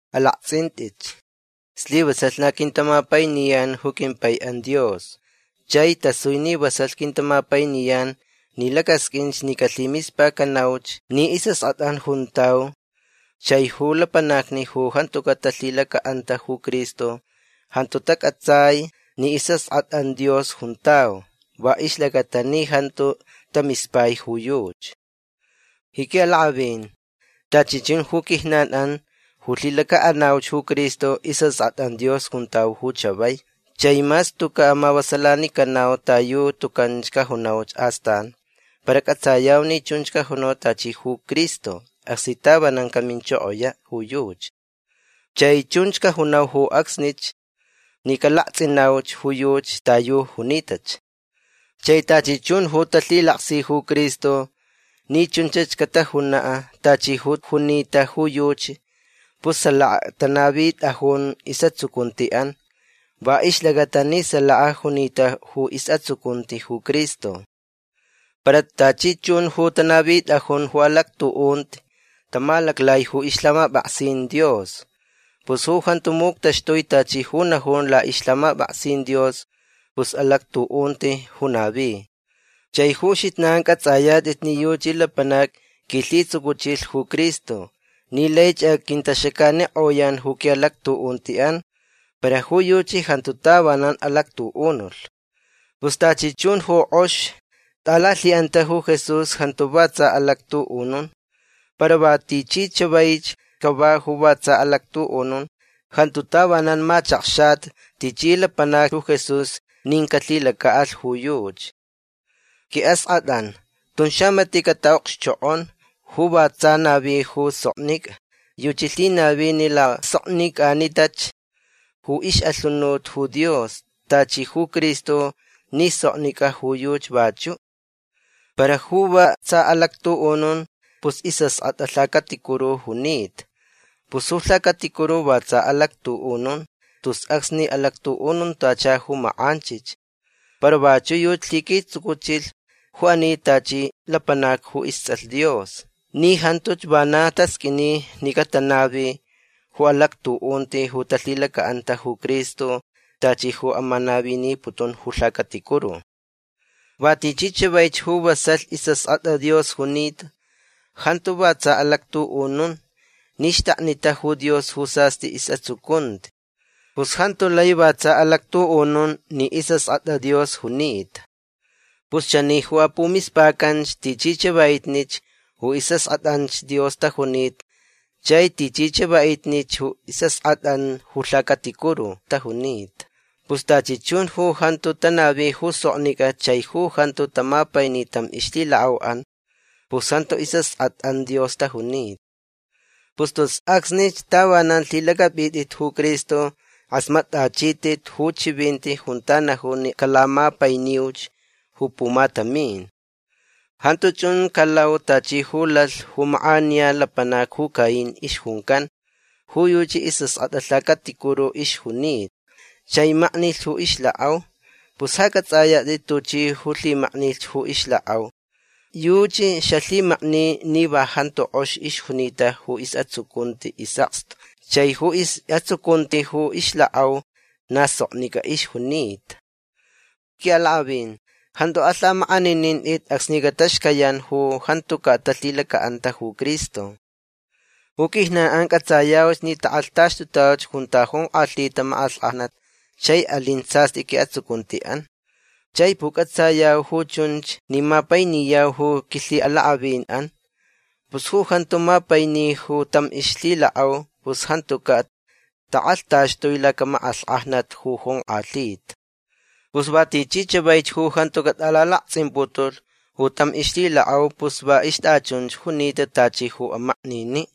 Alakts'int'it. Slivasalh na quintamapainiyan ju quimpai'an Dios. Chai tasui ni vasalh quintamapainiyan ni lacasq'uinch ni calhimispacanauch ni is'ask'at'an juntau. Chai ju lapanacni ju jantuca' talhilaca'anta ju Cristo jantu tac'atsai ni is'ask'at'an Dios juntau va ixlacata ni jantu tamispai ju yuchi. Ji qui'alak'avin tachi chun ju quijnan'an ju lhilaca'anauch ju Cristo is'ask'at'an Dios juntau ju chavai. Chai mas tuca' mavasalanicanau ta yu tucan cajunauch astan para c'atsayau ni chunch cajunau tachi ju Cristo acsni tavanan caminchokoya' ju yuchi. Chai chunch cajunau ju acsnich ni calakts'inauch ju yuchi ta yu junitach. Chai tachi chun ju talhilaksi ju Cristo ni chunch catajuna' tachi ju junita ju yuchi pus salaka tanavit'ajun is'atsucunti'an va ixlacata ni salaka junita ju is'atsucunti ju Cristo. Para tachi chun ju tanavit'ajun ju alactu'unti tamalaclai ju ixlhamap'aksin Dios. Pus ju jantu muctaxtui tachi ju najun la'ixlhamap'aksin Dios pus alactu'unti ju navi. Chai ju uxijnan c'ats'ayat'it ni yuchi lapanac quilhitsucuchilh ju Cristo ni laich aquintaxacanik'oyan ju qui'alactu'unti'an. Para ju yuchi jantu tavanan alactu'unulh. Pus tachi chun ju k'ox t'alalhi'anta ju Jesús jantu va tsa alactu'unun. Para va tichi chavaich cava ju va tsa alactu'unun jantu tavanan machakxata tichi lapanac ju Jesús nin calhilaca'alh ju yuchi. Qui'ask'at'an tun xamati' cata'okxchok'on. Ju va tsa navi ju soknic'a yuchi lhinavi ni lasoknic'anitach ju ix'alhunut ju Dios tachi ju Cristo ni soknic'a ju yuchi vachu'. Para ju va tsa alactu'unun pus is'ask'at'a lhacaticuru junita. Pus ju lhacaticuru va tsa alactu'unun tus acsni alactu'ununtacha ju mak'anchich. Para vachu' yuchi lhiquitsucuchilh ju ani tachi lapanac ju ists'alh Dios ni jantuch vana tasq'uini ni catanavi ju alactu'unti ju talhilaca'anta ju Cristo tachi ju amanaviniputun ju lhacaticuru. Va tichi chavaich ju vasalh is'ask'at'a Dios junita jantu va tsa alactu'unun ni xtaknita ju Dios ju sast'i is'atsucunti. Pus jantu lai va tsa alactu'unun ni is'ask'at'a Dios junita. Pus chani ju apumispacanch tichi chava'itnich ju is'ask'at'anch Dios tajunita chai tichi chava'itnich ju is'ask'at'an ju lhacaticuru tajunita. Pus tachi chun ju jantu tanavi ju soknic'a chai ju jantu tamapaini tam ixlhilak'au'an pus jantu is'ask'at'an Dios tajunita. Pus tus acsni tavanan lhilac'ap'it'it ju Cristo k'asmat'achit'it ju chivinti junta najun ni calamapainiuch ju pumatamin. Jantu chun calau tachi ju lalh ju mak'aniya lapanac ju Caín ixjuncan. Ju yuchi is'ask'at'a lhacaticuru ixjunita chai maknilh ju ixlak'au. Pus ja c'ats'ayat'it tuchi ju lhimaknilh ju ixlak'au. Yuchi xalhimakni ni va jantu k'ox ixjunita ju is'atsucunti is'akstu chai ju is'atsucunti ju ixlak'au na soknic'a ixjunita. Qui'alak'avin jantu alhamak'aninint'it acsni cataxcayan ju jantuca' talhilaca'anta ju Cristo. Ju quijnan'an c'atsayau ni tak'alhtaxtutauch junta jonk'alhita mak'alhk'ajnat chai alin sast'i qui'atsucunti'an. Chai puc'atsayau ju chunch ni mapainiyau ju quilhi'alak'avin'an. Pus ju jantu mapaini ju tam ixlhilak'au pus jantuca' tak'alhtaxtui lacamak'alhk'ajnat ju jonk'alhita. Pus va tichi chavaich ju jantu cat'alalakts'imputulh ju tam ixlhilak'au pus va ixt'achunch junita tachi ju amaknini'.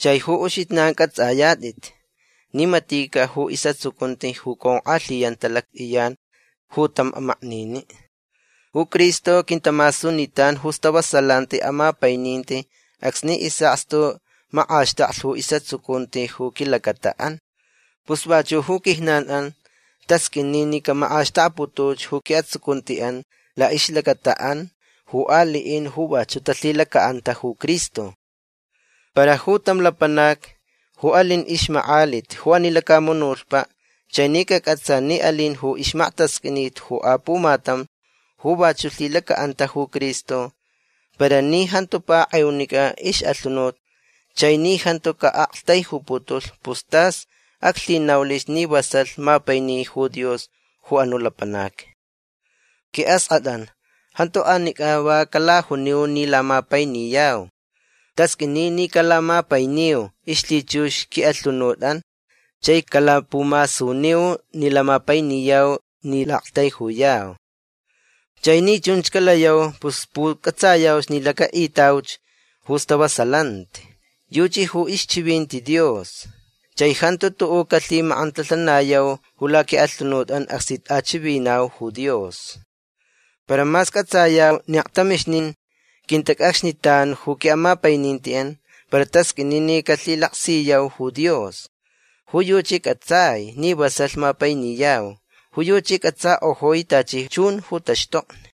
Chai ju uxijnan c'ats'ayat'it ni matica' ju is'atsucunti ju conk'alhiyanta lact'iyan ju tam amaknini'. Ju Cristo quintamasunitan ju istavasalanti amapaininti acsni is'akstu mak'axtaklh ju is'atsucunti ju quilacata'an. Pus vachu' ju quijnan'an tasq'uini ni camak'axtakputuch ju qui'atsucunti'an la'ixlacata'an ju ali'in ju vachu' talhilaca'anta ju Cristo. Para ju tam lapanac ju alin ixmak'alit ju ani lacamunutpa' chai ni cac'atsa ni alin ju ixmaktasq'uinit ju apumatam ju vachu' lhilaca'anta ju Cristo para ni jantu pak'eunic'a ix'alhunut chai ni jantu ca'aktaijuputulh pus tas aclhinaulich ni vasalh mapaini ju Dios ju anu' lapanac. Qui'ask'at'an jantu anic'a va calajuniu ni lamapainiyau. Tasq'uini ni calamapainiu ixlhichux qui'alhunut'an chai calapumasuniu ni lamapainiyau ni la'aktaijuyau. Chai ni chunch calayau pus puc'atsayau ni laca'itauch ju stavasalanti. Yuchi ju ixchivinti Dios. Chai jantu tu'u' calhimak'antalhanayau ju laqui'alhunut'an acsni t'achivinau ju Dios. Para mas c'atsayau ni aktamixnin quintac'acxnitan ju qui'amapaininti'an para tasq'uini ni calhilaksiyau ju Dios. Ju yuchi c'atsai ni vasalh mapainiyau. Ju yuchi c'atsak'ojui tachi chun ju taxtokni.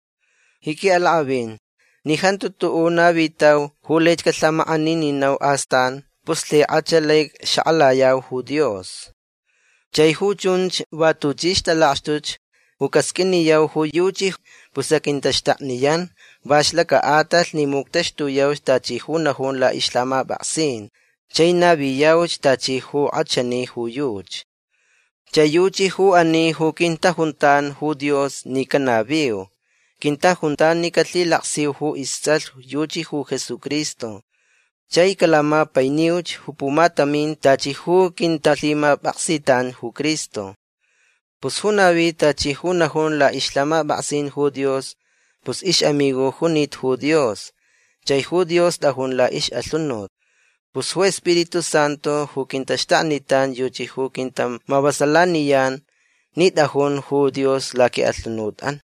Ji qui'alak'avin ni jantu tu'u' navitau ju laich calhamak'anininau astan pus lhik'ach lai xak'alayau ju Dios. Chai ju chunch va tuchi ixtalakxtuch ju casq'uiniyau ju yuchi pus aquintaxtakniyan va ixlaca'atalh ni muctaxtuyau tachi ju najun la'ixlhamap'aksin chai naviyauch tachi ju k'achani ju yuchi. Chai yuchi ju ani ju quintajuntan ju Dios ni canaviu. Quintajuntan ni calhilaksiyau ju ists'alh. Yuchi ju Jesucristo. Chai calamapainiuch ju pumatamin tachi ju quintalhimap'aksitan ju Cristo. Pus ju navi tachi ju najun la'ixlhamap'aksin ju Dios pus ix'amigo junita ju Dios chai ju Dios t'ajun la'ix'alhunut. Pus ju Spiritu Santu ju quintaxtaknitan yuchi ju quintamavasalaniyan ni t'ajun ju Dios laqui'alhunut'an.